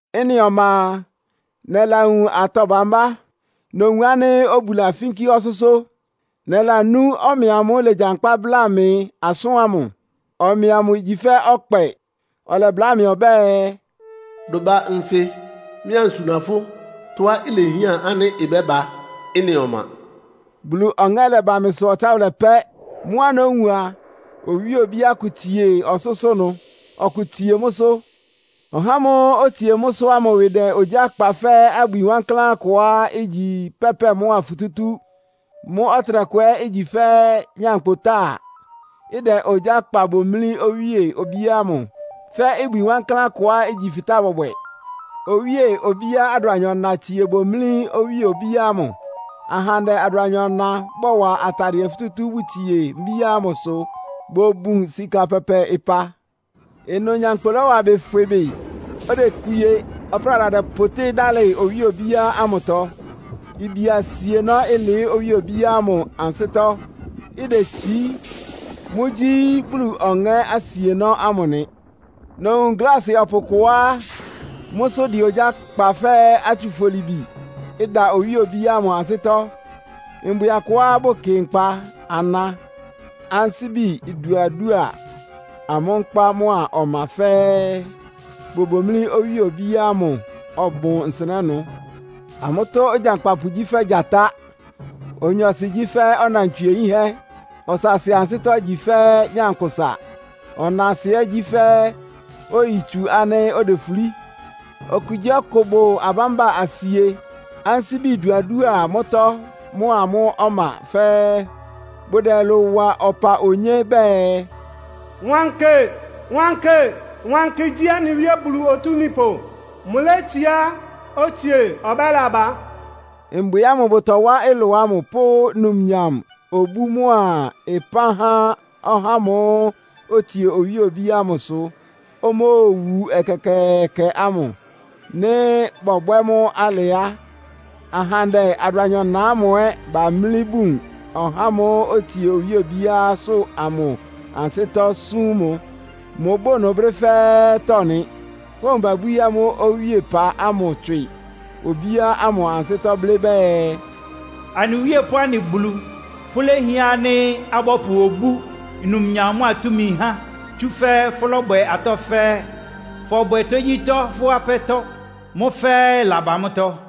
Ɩ́nɩ ɔma a, nɛlawun atɔ́ bámbá. Nowun ánɩ́ obu lafínkí ɔsʋ́sʋ́. Nɛlanú ɔmɛ amʋ́ʋ́ ilegyankpá bláa mɩ asʋ́n ámʋ. Ɔmɛ amʋ igyi fɛ́ ɔkpɛ. Ɔlɛbláa mɩ ɔbɛ́ɛ, “Dʋ ba nfɩ, mɩ́ ansuna fʋ́ tɔ́á ilehián ánɩ́ ɩbɛ́ba ɩ́nɩ ɔma.” Bulu Ɔŋɛ́ lɛba mɩ́sʋ́ ɔtsáwʋlɛ pɛ́. Mʋ́á nówun a, owíe obíá kʋ tsie ɔsʋ́sʋ́ ɩnʋ, ɔkʋ tsie mʋ́sʋ́. Ɔhá ámʋ́ʋ́ otsie mʋ́sʋ́ ámʋ ɩwɩ dɛ́ ogyá kpa fɛ́ abwi wankláán kʋá igyi pɛ́pɛ mʋ́a futútú. Mʋ́ ɔtɩnɛkʋ ɛ́ igyi fɛ́ nyankpʋtáa, ɩdɛ ogyá kpa bomlí owíe obíá ámʋ fɛ́ ibwi wankláán kʋá igyi fɩtáa bɔbwɛ. Owíe-mbíá adʋanyɔ-na itsie bomlí owíe obíá ámʋ. Ahandɛ adʋanyɔ-na bɔwa atadɩɛ futútú bʋtsie mbíá ámʋsʋ, bʋbun sika pɛpɛ ɩpa. Ɩnʋ nyankpʋ lɔ́wa ɩbɩ fwɩ bɩ. Odekpie, ɔpráda dɛpʋtɩ́ dálɩ owíe obíá ámʋtɔ. Ibia asienɔ́ ɩlɩɩ́ owíe obíá ámʋ ansɩ́tɔ́, idetsií. Mʋ́gyí Bulu Ɔŋɛ́ asienɔ́ ámʋ nɩ. Nowun gláasɩ ɔpʋ kʋá mʋ́sʋ́ ɩdɛ ogyá kpa fɛ́ atsufolibi, ɩda owíe obíá ámʋ ansɩ́tɔ́. Mbwɩ akʋá bʋkɩ nkpa ana, ansíbi iduadúa amʋ́ nkpá mʋ́a ɔma fɛ́ɛ́, bobomlí owíe obíá ámʋ ɔbʋn nsɩnɛ́ ɩnʋ. Amʋ́tɔ́ ogyankpapʋ gyí fɛ́ gyatá. Onyɔɔsɩ gyí fɛ́ ɔnantswie yínhɛ́. Ɔsaasɩ ansɩ́tɔ́ igyi fɛ́ nyankpʋsa, ɔnaasɩ ɛ́ gyí fɛ́ oyitsu ánɩ́ odefulí. Okugyíɔkʋ bʋ abámba asie, ansíbi iduadúa mʋ́tɔ́ mʋ́a mʋ́ ɔma fɛ́ɛ́. Bʋdɛ ɩlʋ wa ɔpa onyé bɛɛ, “Wankɩ, wankɩ, wankɩ gyí anɩ Wíe Bulu Otúmípʋ. Mʋlétsiá, otsie, ɔbɛ́laba.” Mbwɩ ámʋ bʋtɔwá ɩlʋ ámʋ, pʋ́ numnyam, obú mʋ́a ɩpán há ɔhá ámʋ́ʋ́ otsie owíe obíá ámʋsʋ, omóowu ɛkɛkɛɛkɛ ámʋ. Nɩ́ bɔbwɛ́ mʋ́ alɩ á, ahandɛ adʋanyɔ-na ámʋ ɛ́ bamlí bun ɔhá ámʋ́ʋ́ otsie owíe obíásʋ́ amʋ ansɩ́tɔ́ súm mʋ. Mʋbʋ́ʋ ɩnʋ brɛ́ fɛ́ɛ́tɔ́ nɩ. Fówun babwíí amʋ́ owíepa ámʋ tswɩ obíá ámʋ ansɩ́tɔ́ blɩ́ bɛɛ, “Anɩ Wíe pʋ́ anɩ Bulu! Fʋ́lehián ánɩ́ abɔ́pʋ obú, numnyam mʋ́a túmi há, tsúfɛ́ fʋ́lɔ́bwɛ atɔ́ fɛ́ɛ́. Fɔbwɛ tógyítɔ́ fʋ́ apɛ́tɔ́. Mʋ́ fɛ́ɛ́ ɩlaba mʋ́tɔ́.”